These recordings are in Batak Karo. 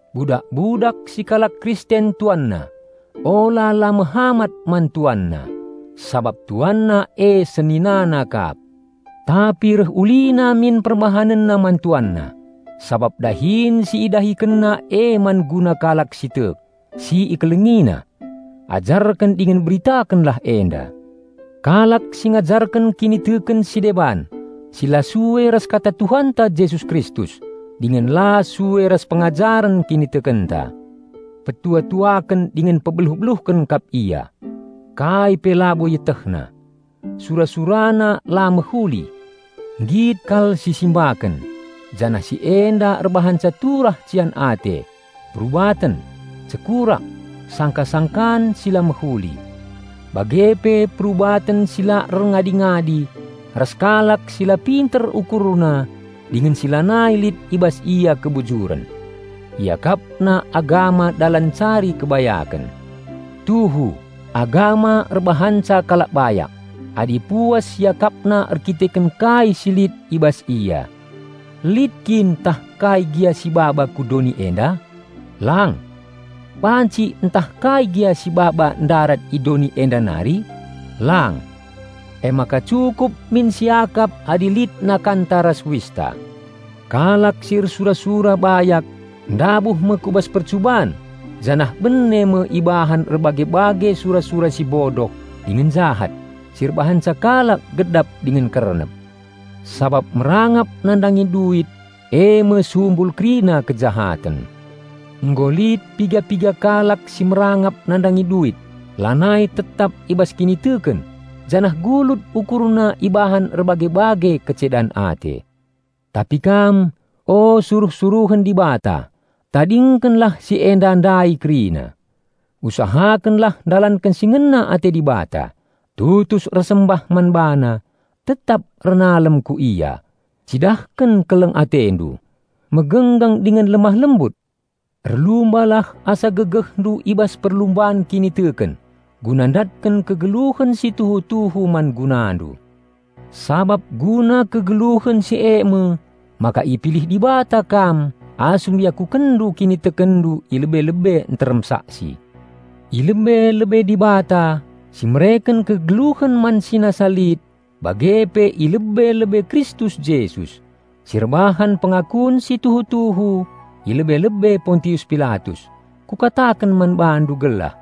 Budak-budak si kalak Kristen tuanna, ula la mehamat man tuanna, sabap tuanna e seninana kap. Tapi reh ulina min perbahanenna man tuanna, sabap dahin si idahikenna e man guna kalak si tek, si ikelengina. Pengajaren si la tuhu ras kinibayaken si tuhu-tuhu Ajarken dingen beritakenlah enda. Kalak si ngajarken kiniteken si deban si la sue ras Kata Tuhanta Jesus Kristus dingen la sue ras pengajaren kinitekenta, petua-tuaken dingen pebeluh-beluhken kap ia. Kai pe labo ietehna. Sura-surana la mehuli. Nggit kal sisimbaken; janah si enda erbahanca turah cian ate, perubaten, cekurak, sangka-sangkan si la mehuli, bage pe perubaten si la erngadi-ngadi ras kalak si la pinter ukurna dingen si lanai lit i bas ia kebujuren. Iakapna agama dalan ncari kebayaken. Tuhu, agama erbahanca kalak bayak, adi puas iakapna erkiteken kai si lit i bas ia. Lit kin tah kai gia sibaba ku doni enda? Lang! Banci ntah kai gia sibaba ndarat i doni enda nari? Lang! Emaka cukup min siakap adi lit nakanta ras uista. Kalak si ersura-sura bayak ndabuh me ku bas percuban janah bene me ibahan erbage-bage sura-sura si bodoh dingen jahat, si erbahanca kalak gedap dingen kernep. Sabap merangap nandangi duit e me sumbul kerina kejahaten. Nggo lit piga-piga kalak si merangap nandangi duit lanai tetap i bas kiniteken janah gulut ukurna ibahan erbage-bage kecedan ate. Tapi kam, o suruh-suruhen Dibata, tadingkenlah si enda ndai kerina. Usahakenlah ndalanken si ngena ate Dibata, tutus ersembah man BaNa, tetap ernalem ku Ia, cidahken keleng atendu, megenggeng dingen lemah lembut! Erlumbalah asa gegehndu i bas perlumban kiniteken, guna ndatken kegeluhen si tuhu-tuhu man gunandu. Sabap guna kegeluhen si e me maka ipilih Dibata kam asum iakukenndu kinitekenndu i lebe-lebe nterem saksi. I lebe-lebe Dibata, si mereken kegeluhen man si nasa lit bage pe i lebe-lebe Kristus Jesus, si erbahan pengakun si tuhu-tuhu i lebe-lebe Pontius Pilatus, kukataken man bandu gelah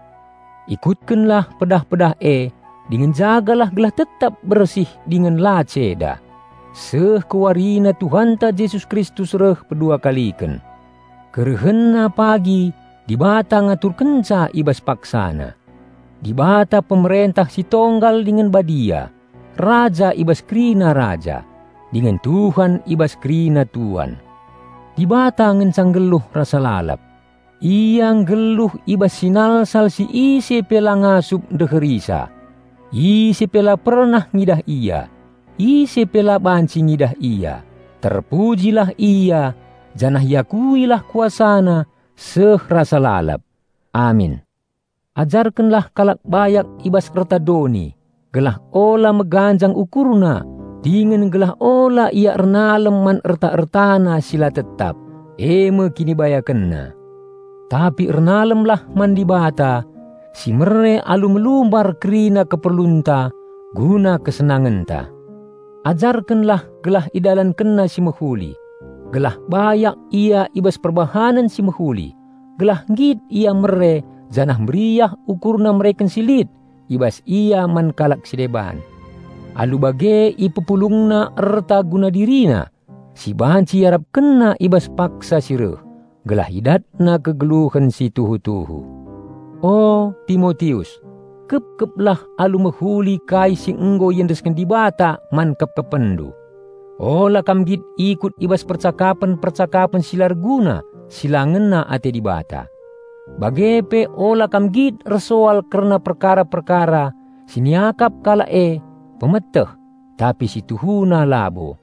ikutkenlah pedah-pedah e dingen jagalah gelah tetap bersih dingen la ceda, seh ku warina Tuhanta Jesus Kristus reh peduakaliken. KerehenNa pagi Dibata ngaturkenca i bas paksana. Dibata Pemerentah Si Tonggal dingen Badia, Raja i bas kerina raja, dingen Tuhan i bas kerina tuan. Dibata ngenca nggeluh rasa lalap. Ia nggeluh i bas sinalsal si ise pe la ngasup ndeherisa. Ise pe la pernah ngidah Ia, ise pe la banci ngidah Ia, terpujilah Ia janah iakuilah KuasaNa seh rasa lalap! Amin. Ajarkenlah kalak bayak i bas erta doni gelah ula meganjang ukurna dingen gelah ula ia ernalem man erta-ertana si la tetap, e me kinibayakenna, tapi ernalemlah man Dibata, si mere alu melumbar kerina keperlunta guna kesenangenta. Ajarkenlah gelah idalankenna si mehuli, gelah bayak ia i bas perbahanen si mehuli, gelah nggit ia mere janah meriah ukurna mereken si lit i bas ia man kalak si deban. Alu bage ipepulungna erta guna dirina si banci iarapkenna i bas paksa si reh, gelah idatna kegeluhen si tuhu-tuhu. O, Timotius, kepkeplah alu mehuli kai si nggo iendesken jadi tanggung jababndu. Tadingkenlah percakapen-percakapen si la erguna si la ngena ate Dibata. Bage pe tadingken sijapapen kerna si iakap kalak e "pemeteh" tapi si tuhuna labo.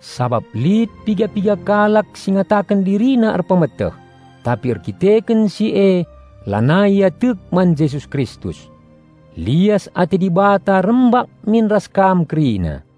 Sabap lit piga-piga kalak si ngataken dirina erpemeteh, tapi erdandanken si e lanai ia tek man Jesus Kristus. Lias ate Dibata rembak min ras kam kerina.